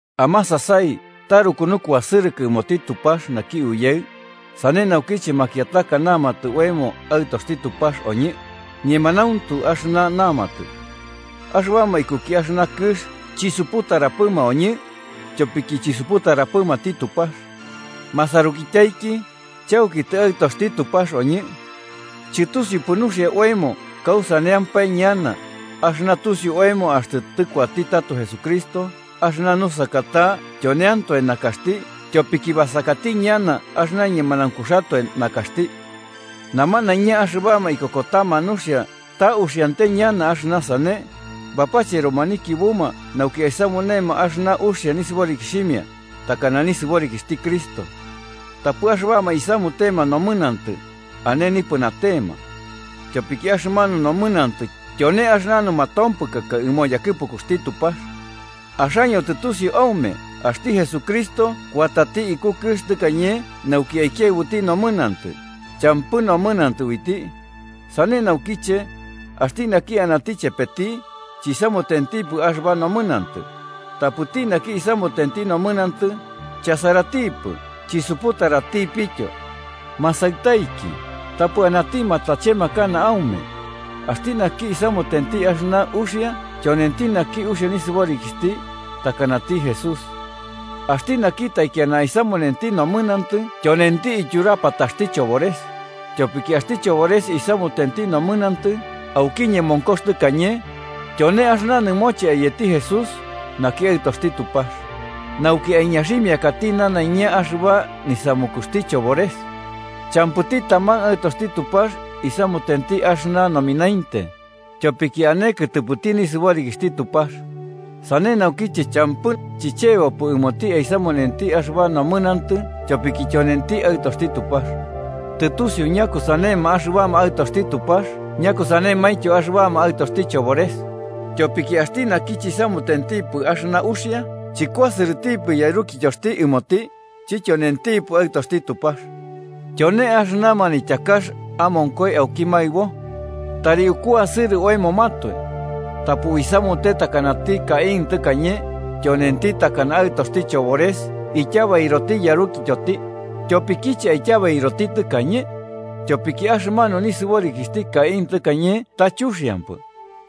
Amasasai taruku nukuasɨrɨkɨ ɨmoti Tupax naki Uyaɨ, sane naukiche makiataka namatɨ oemo aɨtoxti Tupax oñɨ, ñemanauntu axɨna namatɨ. Axɨbama ikuki axɨna kɨx chisuputarapɨma oñɨ, tyopiki chisuputarapɨmati Tupax. Masarukityaiki, chauki tɨaɨtoxti Tupax oñɨ. Chɨtusiupɨ nuxia oemo kausaneampae ñana, axɨna tusiu oemo axtɨ tɨkuatati tato Jesucristo axɨna nusaka ta tyoneantoe nakaxti, tyopiki basakati ñana axɨna ñemanaunkuxatoe nakaxti. Namanaiña axɨbama ikokotama nuxia ta uxiante ñana axɨna sane, bapacheroma nikiubuma nauki aisamunema axɨna uxia nisɨborikixhimia, takana nisɨborikixhti Cristo. Tapɨ axɨbama isamutema nomɨnantɨ, ane nipɨnatema. Tyopiki axɨmanu nomɨnantɨ tyone axɨna numatompɨkaka ɨmo yakɨpukuxti Tupax. Axaño tɨtusiu aume axti Jesucristo kuatati iku kɨx tɨkañe nauki aikiaɨbuti nomɨnantɨ, champɨ nomɨnantɨ uiti. Sane naukiche, axti naki anati chepeti, chisamutentipɨ axɨba nomɨnantɨ. Tapɨti naki isamutenti nomɨnantɨ, chasaratipɨ chisuputaratipityo. Masaɨtaiki, tapɨ anati matachemakana aume: axti naki isamutenti axɨna uxia tyonenti naki uxia nisɨborikixhti, takanati Jesús. Axti naki taikiana aisamunenti nomɨnantɨ tyonenti ityurapataxti chobores, tyopiki axti chobores isamutenti nomɨnantɨ auki ñemonkox tɨkañe, tyone axɨna nɨmoche ayetitɨ Jesús, naki Aɨtoxti Tupax: nauki aiñaximiakati nanaiña axɨba nisamukuxti chobores. Champɨti taman aɨtoxti Tupax isamutenti axɨna nominainte, tyopiki ane kɨtɨpɨti nisɨborikixhti Tupax. Sane naukiche champɨ chɨchebopɨ ɨmoti aisamunenti axɨba nomɨnantɨ tyopiki tyonenti aɨtoxti Tupax. Tɨtusiuma ñakusanema axɨbama aɨtoxti Tupax ñakusanemaintyo axɨbama aɨtoxti chobores, tyopiki axti naki chisamutentipɨ axɨna uxia chɨkuasɨrɨtipɨ yarukityoxti ɨmoti, chityonentipɨ aɨtoxti Tupax. Tyone axɨna manityakax amonkoi auki maɨbo: tari ukuasɨrɨ oemomatoe. Tapɨ uisamute takanati Caín tɨkañe, tyonenti takana aɨtoxti chobores ityabairoti yarukityoti. ¿Tyopikiche aityabairoti tɨkañe? Tyopiki axɨmanu nisɨborikixhti Caín tɨkañe ta chuxiampɨ,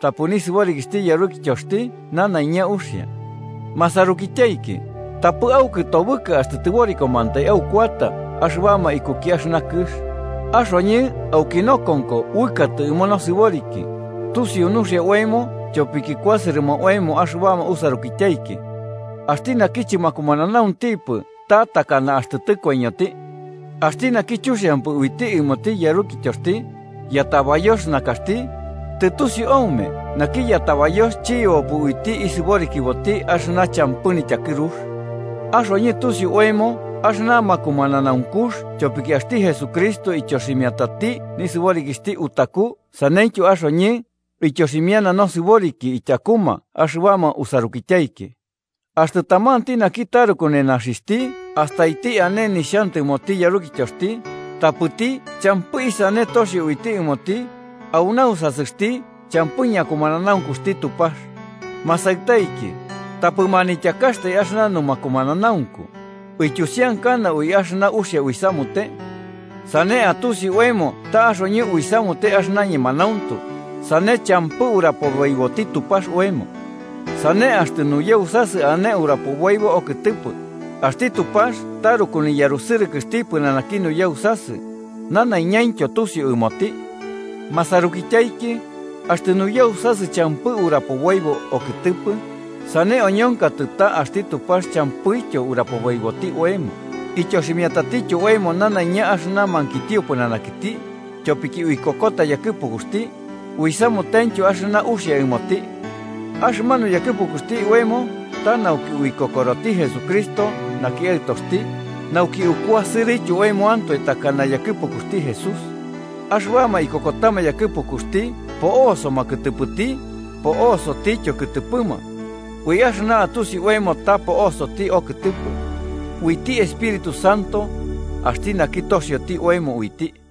tapɨ nisɨborikixhti yarukityoxti nanaiña uxia. Masarukityaiki, tapɨ aukɨtobɨka, axtɨ tɨborikomantai aukuata axɨbama ikuki axɨna kɨx. Axoñɨ auki nokonko uɨkatɨ ɨmo nosɨboriki, tusiu nuxia oemo tyopiki kuasɨrɨma oemo axɨbama usarukityaiki. Axti naki chɨmakumananauntipɨ ta takana axtɨ tɨkoiñoti. Axti naki chuxiampɨ uiti ɨmoti yarukityoxti, yatabayox nakaxti, tɨtusiu aume naki yatabayox chiyebopɨ uiti isɨborikiboti axɨna champɨ nityakɨrux. Axoñɨ tusiu oemo axɨna makumananaunkux tyopiki axti Jesucristo ityoximiatati nisɨborikixhti utaku saneityo axoñɨ, uityoximiana nosɨboriki tyakuma axɨbama usarukityaiki. Axtɨ tamanti naki taruku nenaxixhti astaiti ane nixhantɨmoti yarukityoxti, tapɨti champɨ isane toxio uiti ɨmoti, au nausasɨxti champɨ ñakumananaunkuxti Tupax. Masaɨtaiki, tapɨ manityakaxtai axɨna numakumananaunku, uityusiankana ui axɨna uxia uisamute. Sane atusi oemo ta axoñɨ uisamute axɨna ñemanauntu, sane champɨ arapoboiboti Tupax oemo. Sane axtɨ nuyausasɨ ane urapoboibo okɨtɨpɨ, axti Tupax taruku niyarusɨrɨkɨxti pɨnanaki nuyausasɨ, nanaiñaintyo tusiu ɨmoti. Masarukityaiki, axtɨ nuyausasɨ champɨ urapoboibo okɨtɨpɨ, sane oñonkatɨ ta axti Tupax champɨityo urapoboiboti oemo. Ityoximiatatityo oemo nanaiña axɨna mankitio pɨnanakiti, tyopiki uikokota yakɨpukuxti, uisamutentyo axɨna uxia ɨmoti. Axɨmanu yakɨpukuxti oemo ta nauki uikokoroti Jesucristo naki Aɨtoxti, nauki ukuasɨrɨtyo oemoantoe takana yakɨpukuxti Jesús. Axɨbama ikokotama yakɨpukuxti po'osoma kɨtɨpɨti, po'sotityo kɨtɨpɨma. Ui axɨna atusi oemo ta po'osoti okɨtɨpɨ: uiti Espíritu Santo, axti naki toxioti oemo uiti.